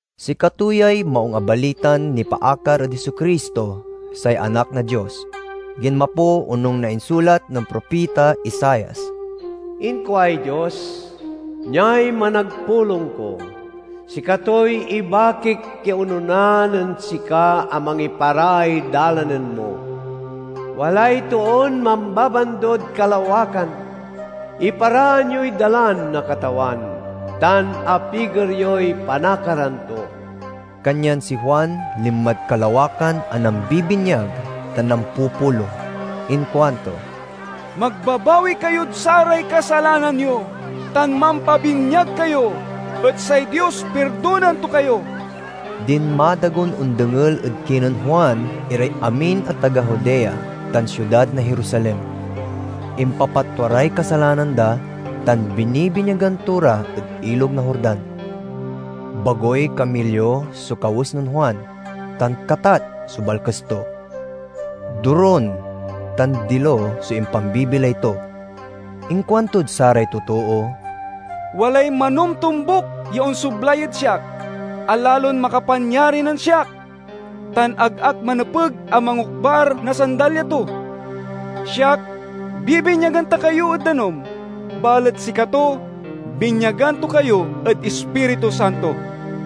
Sikato yay Maung a Balitan nipaakar ed Jesu-Cristo, say Anak na Dios. Ginmapo onung na insulat nen propita Isaias: "Inkuay Dios, 'Niay managpulong ko. Sikatoy ibakik ya onona nen sika a mangiparaay dalanen mo.' Walay toon mambabandod kalawakan, 'Iparaan yoy dalan na Katawan tan apiger yoy panakaran to!'" Kanyan si Juan linmad kalawakan a nambibinyag tan nampupulong. Inkuanto, "Magbabawi kayod saray kasalanan yo tan mampabinyag kayo, et say Dios pirdonaen to kayo." Dinmadagon ondengel ed kinen Juan iray amin a taga Judea tan siudad na Jerusalem. Impapatwa ray kasalanan da, tan binibinyagan to ra ed Ilog na Jordan. Bagoy kamilyo so kawes nen Juan, tan katat so balkes to. Dorun tan dilo so impambibilay to. Inkuantod saray totoo, "Walay manomtombuk ya onsoblay ed siak a lalon makapanyari nen siak, tan ag ak manepeg a mangokbar na sandalya to. Siak bibinyagan ta kayo ed danum, balet sikato binyagan to kayo ed Ispiritu Santo."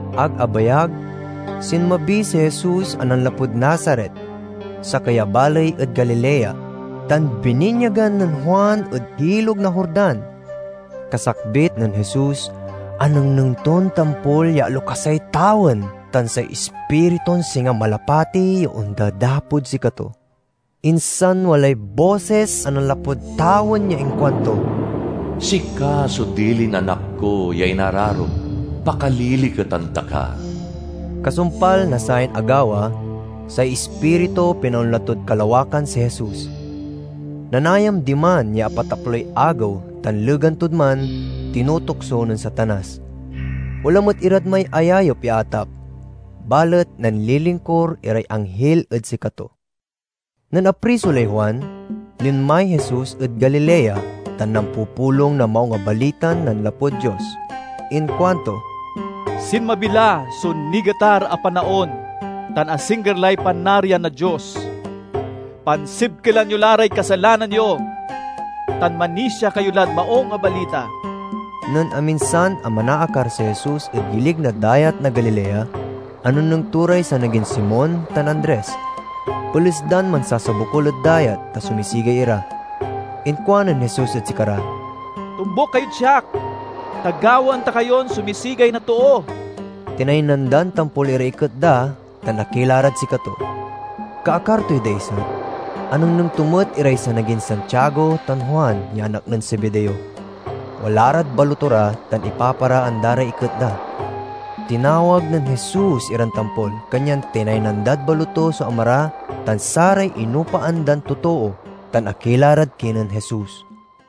Ag abayag, sinmabi si Jesus a nanlapud Nazaret, sakey a baley ed Galilea, tan bininyagan nen Juan ed Ilog na Jordan. Kasakbit nen Jesus, anengneng ton tampol ya alokasay tawen tan say Ispritun singa malapati ya ondadapod sikato. Insan walay bosis a nanlapud tawen ya inkuanto, "Sika so dilin Anak ko ya inararok; pakaliliketan ta ka." Kasumpal na sayan agawa, say Ispiritu pinaonla tod kalawakan si Jesus. Nanayam diman ya apataploy agew tan legan tod man, tinutukso nen Satanas. Wala met irad may ayayep ya atap, balet nanlilingkur iray anghil ed sikato. Nen apriso lay Juan, linmay Jesus ed Galilea tan nampupulong na Maung a Balitan nanlapud Dios. Inkuanto, "Sinmabi la so nigetar a panaon tan asingger lay Panarian na Dios! pansibkelan yo la ray kasalanan yo, tan manisia kayo lad Maung a Balita!" Nen aminsan a manaakar si Jesus ed gilig na Dayat na Galilea, anengneng to ray sanagin Simon tan Andres. Peles dan mansasabokul ed dayat, ta sumisigay ira. Inkuanen Jesus ed sikara, "Tombuk kayod siak, ta gawaen ta kayon sumisigay na too." Tinaynan dan tampol iray iket da, tan akila rad sikato. Kaakar toy daiset, anengneng to met iray sanagin Santiago tan Juan ya anak nen Zebedeo. Wala rad baloto ra tan ipaparaan da ray iket da. Tinawag nen Jesus iran tampol, kanyan tinaynan dad baloto so ama ra tan saray inopaan dan totoo, tan akila rad kinen Jesus.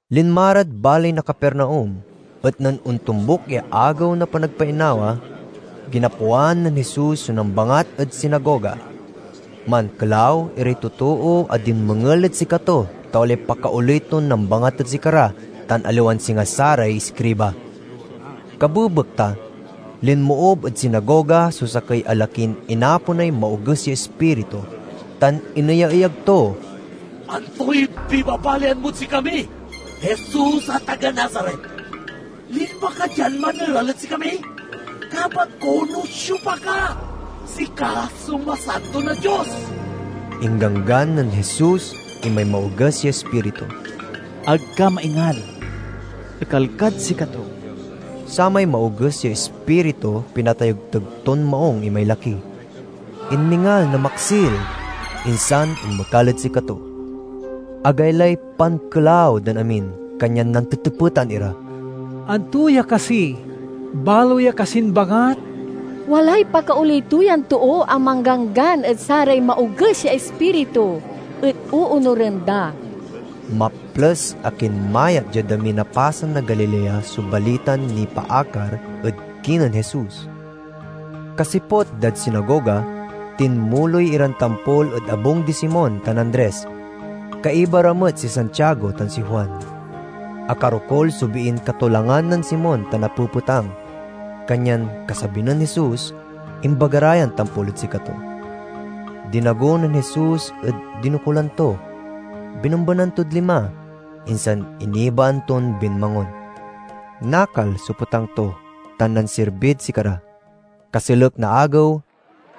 Linma rad baley na Capernaum, et nen ontombuk ya Agew na Panagpainawa, ginapoan nen Jesus so nambangat ed sinagoga. Mankelaw iray totoo a dinmengel ed sikato ta walay pakaoley ton nambangat ed sikara, tan aliwan singa saray iskriba. Kabebekta linmoob ed sinagoga so sakey a lakin inaponay maoges ya ispiritu, tan ineyaeyag to, "Antoy pibabalian mod sikami, Jesus a taga Nazaret? Linma ka dian maneral ed sikami? Kabat ko no siopa ka: sika so Masanto na Dios!" Ingganggan nen Jesus imay maoges ya ispiritu, "Ag ka maingal! Ekal kad sikato!" Samay maoges ya ispiritu pinatayegteg ton maung imay laki, inmingal na maksil, insan inmekal ed sikato. Agaylay pankelaw dan amin, kanyan nantetepetan ira, "Anto ya kasi? Balo ya kasin bangat? Walay pakaoley to yan too a mangganggan ed saray maoges ya ispiritu, et oonuren da!" Maples a kinmayat diad amin a pasen na Galilea so balitan nipaakar ed kinen Jesus. Kasiput dad sinagoga, tinmuloy iran tampol ed abung di Simon tan Andres. Kaiba ra met si Santiago tan si Juan. Akarokul so biin katolangan nen Simon, ta napepetang. Kanyan kasabi nen Jesus, imbaga ra yan tampol ed sikato. Dinago nen Jesus ed dinokulan to, binembenan tod lima, insan inibaan ton binmangon. Nakal so petang to, tan nansirbid sikara. Kaselek na agew,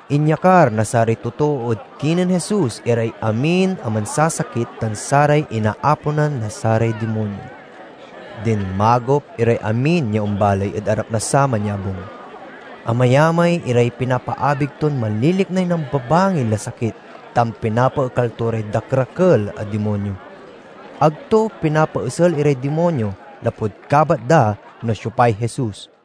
inyakar na saray totoo ed kinen Jesus iray amin a mansasakit tan saray inaaponan na saray dimonyo. Dinmagop iray amin ya ombaley ed arap na saman ya abung. Amayamay iray pinapaabig ton manliliknay nambabangil a sakit tan pinapaekal to ray dakerakel a dimonyo. Ag to pinapaesel iray dimonyo, lapud kabat da no siopay Jesus.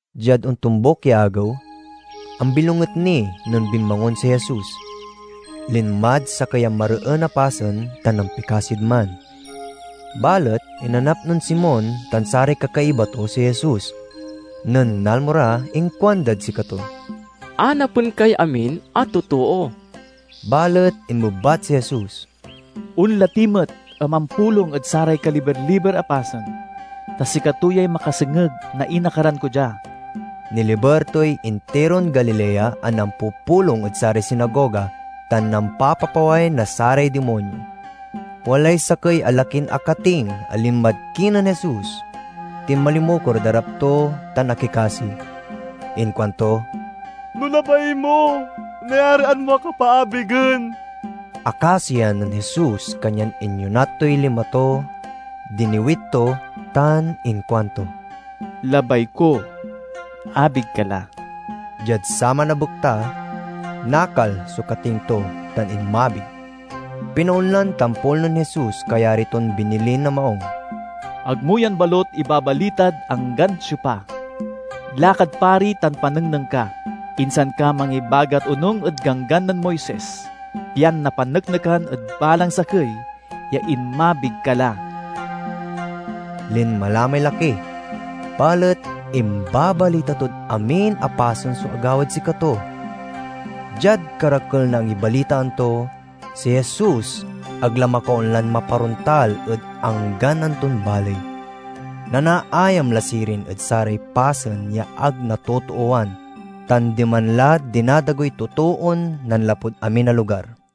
Diad ontombuk ya agew, ambilonget ni nen binmangon si Jesus. Linmad sakey a mareen a pasen tan nampikasid man. Balet inanap nen Simon tan saray kakaiba to si Jesus. Nen nalmo ra inkuandad sikato, "Anapen kay amin a totoo." Balet inmebat si Jesus, "Onla ti met a mampulong ed saray kaliber-liber a pasen, ta sikato yay makasengeg na inakaran ko dia." Niliber toy intiron Galilea a nampupulong ed saray sinagoga tan nampapapaway na saray dimonyo. Walay sakey a lakin akating a linmad kinen Jesus, tinmalimukor ed arap to tan akikasi. Inkuanto, "No labay mo, nayarian mo ak a paabigen." Akasian nen Jesus kanyan inyonat toy lima to, diniwit to, tan inkuanto, "Labay ko. Abig ka la!" Diad saman a bekta nakal so kating to tan inmabig. Pinaonlan tampol nen Jesus kayari ton binilin a maung, "Ag mo yan balut ibabalitad anggan siopa. Lakad pari tan panengneng ka, insan ka mangibagat onung ed Ganggan nen Moises, pian napaneknekan ed balang sakey ya inmabig ka la." Linma la may laki, balet imbabalita tod amin a pasen so agawad sikato. Diad karakel na angibalitaan to, si Jesus ag la makaonlan maparontal ed anggan anton baley. Nanaayam la sirin ed saray pasen ya ag natotoowan, tan diman la dinadagoy totoon nanlapud amin a lugar.